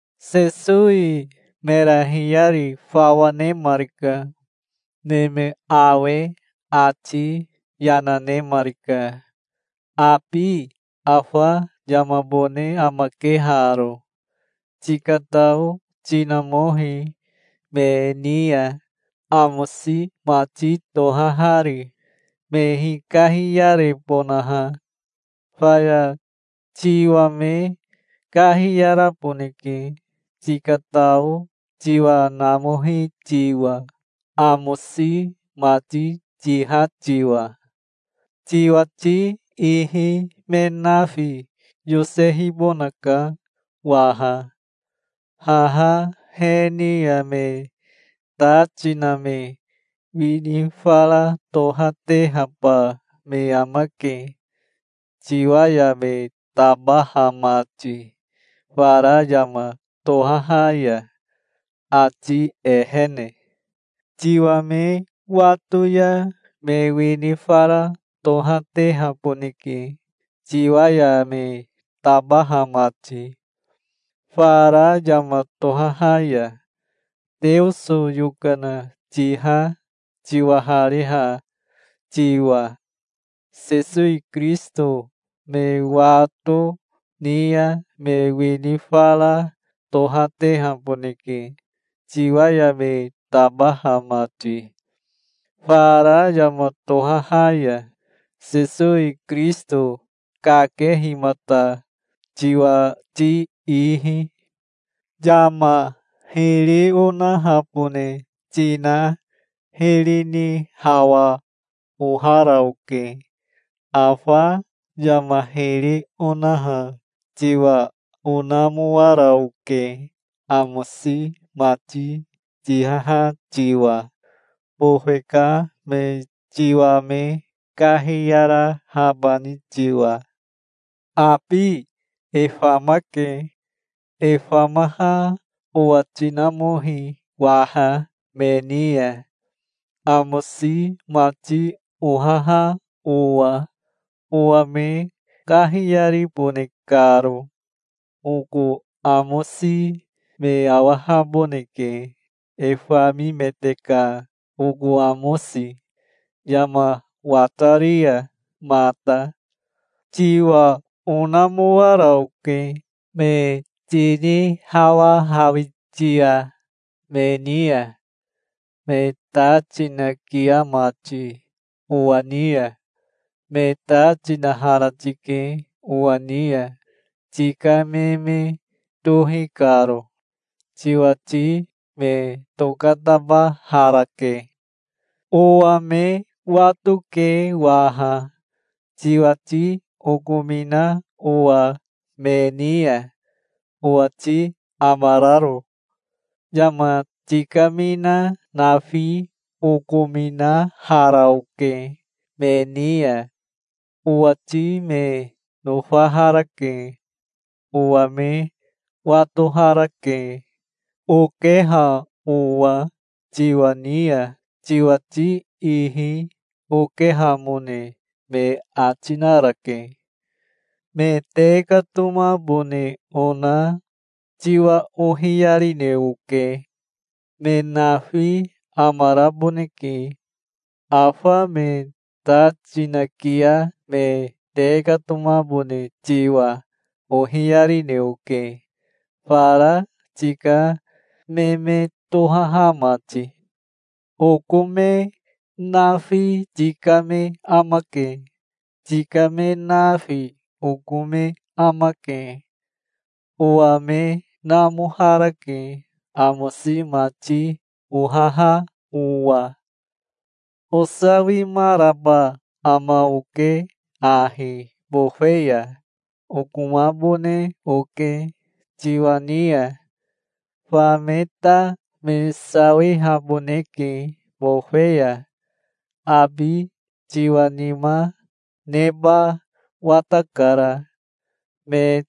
Sesowi mera hiyari fawa nemarika. Neme awe ati yana nemarika. "Abi afa yamabone amake haro. Tikatao tinamohi me ni ya, amosi mati tohahari, me hikahiyarebonaha. Faya tiwa me kahiyaraboneke, tikatao tiwa namohi tiwa, amosi mati tiha tiwa. Tiwati ihi me nafi yosehibonaka waha. Haha he ni ya me ta tina me wini fara tohatehaba me amake tiwa ya me tabaha mati fara yama tohaha ya, ati ehene. Tiwa me wato ya me wini fara tohatehaboneke tiwa ya me tabaha mati, fara yama tohaha ya, Teoso yokana tiha tiwahariha tiwa. Sesowi Kirisito me wato ni ya me wini fara tohatehaboneke tiwa ya me tabaha mati, fara yama tohaha ya, Sesowi Kirisito kakehimata tiwati ihi. Yama hiri onahabone tina hiri ni hawa ohara oke. Afa yama hiri onaha tiwa onamoara oke amosi mati tihaha tiwa, bofe ka me tiwa me kahiyarahabani tiwa. Abi e famake. E famaha owa tinamohi waha me ni ya, amosi mati ohaha owa, owa me kahiyaribone karo. Oko amosi me awahaboneke, e famimete ka oko amosi, yama watari ya mata". "Tiwa onamoara oke, me tinihawahawitia me ni ya, me ta tinakia mati owa ni ya. Me ta tinahara tike owa ni ya, tika me me tohi karo. Tiwati me tokatabaharake. Owa me watoke waha, tiwati okomina owa me ni ya, owati amararo. Yama tikamina nafi okominahara oke me ni ya. Owati me nofaharake. Owa me watoharake, okeha owa tiwa ni ya. Tiwati ihi okehamone me ati narake. Me tekatomabone ona tiwa ohiyarine oke. Me nafi amaraboneke. Afa me ta tinakia me tekatomabone tiwa ohiyarine oke, fara tika me me tohaha mati. Oko me nafi tika me amake. Tika me nafi oko me amake. Owa me namoharake, amosi mati ohaha owa. Osawimaraba ama oke ahi bofe ya. Okomabone oke tiwa ni ya. Fa me ta me sawihaboneke bofe ya. Abi tiwa nima neba watakara. Me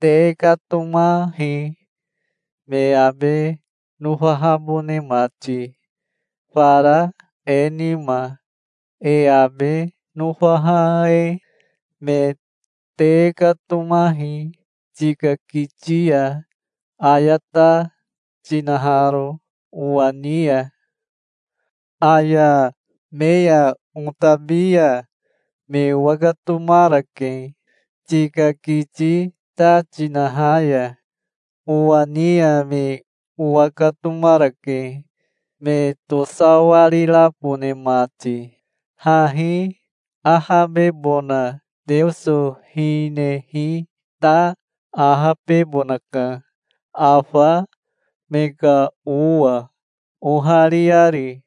tekatomahi me abe nofahabone mati, fara e nima, e abe nofaha e. Me tekatomahi tika kiti ya, aya ta tinaharo owa ni ya. Aya me ya otabi ya me owakatomarake tika kiti ta tinaha ya owa ni ya. Me owakatomarake, me tosawarirabone mati. Hahi ahabebona Teoso hinehi ta ahabebonaka, afa me ka owa, ohariari,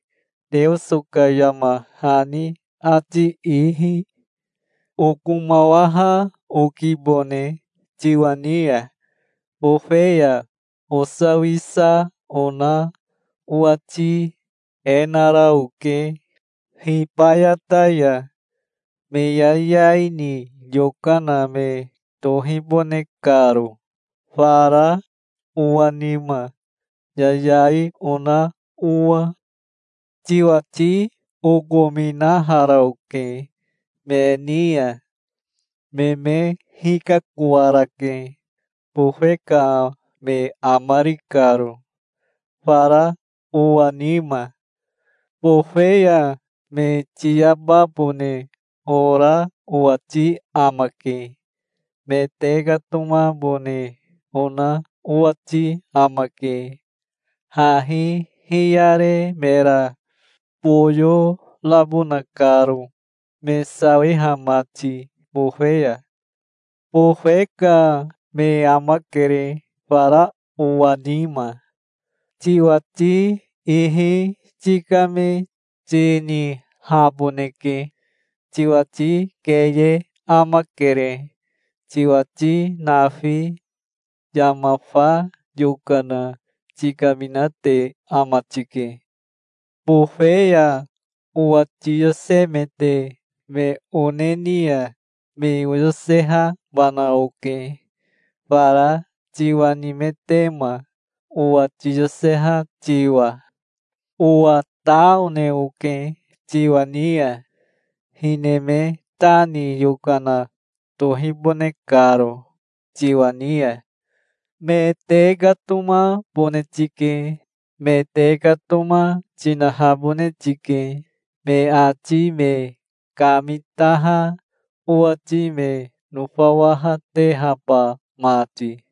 Teoso ka yama hani ati ihi. Okomawaha okibone tiwa ni ya. Bofe ya osawisa ona owati e nara oke hibayata ya, me yayai ni yokana me tohibone karo, fara owa nima, yayai ona owa. Tiwati okominahara oke me ni ya. Me me hikakoarake, bofe ka me amari karo, fara owa nima. Bofe ya me tiyababone ora owati amake. Me tekatomabone ona owati amake, hahi hiyare mera boyo rabona karo, me sawiha mati bofe ya. Bofe ka me amakere fara owa nima. Tiwati ihi tika me tinihaboneke. Tiwati keye amakere, tiwati nafi. Yama fa yokana tikaminate ama tike. Bofe ya owa tiyosemete me one ni ya me oyosehabana oke, fara tiwa nimetema, owa tiyoseha tiwa. Owa ta one oke tiwa ni ya, hine me ta ni yokana tohibone karo tiwa ni ya". "Me tekatomabone tike. Me tekatoma tinahabone tike, me ati me kamitaha owati me nofawahatehaba mati.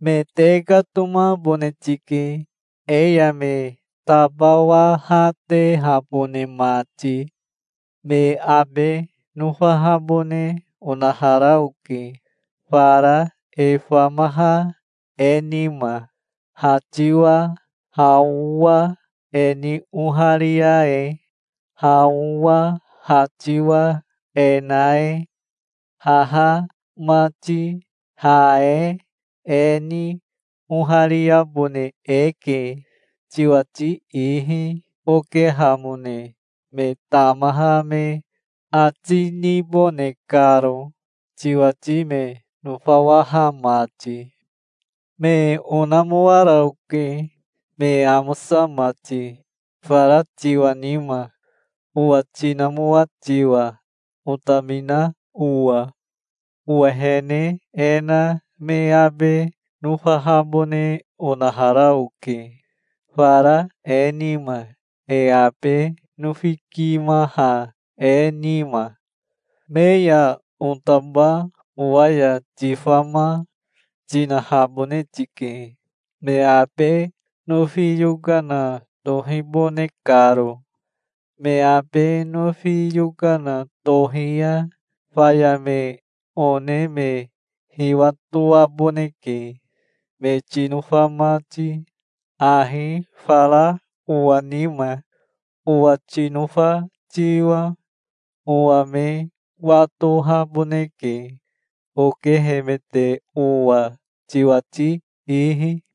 Me tekatomabone tike, e ya me tabawahatehabone mati. Me abe nofahabone onahara oke, fara e famaha e nima, ha tiwa ha owa e ni oharia e, ha owa ha tiwa e na e. Haha mati ha e e ni ohariabone eke, tiwati ihi okehamone me tamaha me ati nibone karo, tiwati me nofawaha mati. Me onamoara oke, me amosa mati, fara tiwa nima, owa tinamoa tiwa, otamina owa. Owehene e na me abe nofahabone onahara oke, fara e nima, e abe nofikimaha e nima. Me ya otaba owa ya tifama, tinahabone tike, me abe nofi yokana tohibone karo. Me abe nofi yokana tohi ya faya me one me hiwatoaboneke, me tinofa mati, ahi fara owa nima, owa tinofa tiwa. Owa me watohaboneke, okehemete owa tiwati ihi.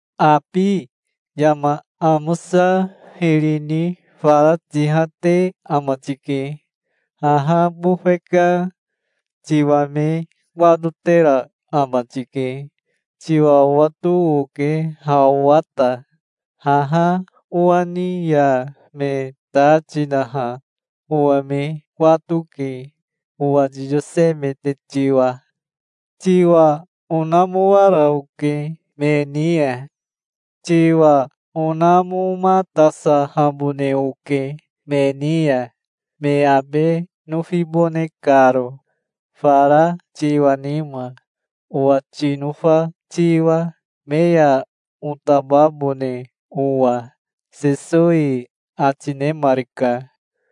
Abi yama amosa hiri ni fara tihate ama tike. Haha bofe ka tiwa me watotera ama tike. Tiwa owato oke ha owa ta. Haha owa ni ya me ta tinaha owa me wato ke, owa tiyosemete tiwa. Tiwa onamoara oke me ni ya. Tiwa onamomatasahabone oke me ni ya, me abe nofibone karo, fara tiwa nima, owa tinofa tiwa, me ya otababone owa", Sesowi ati nemarika.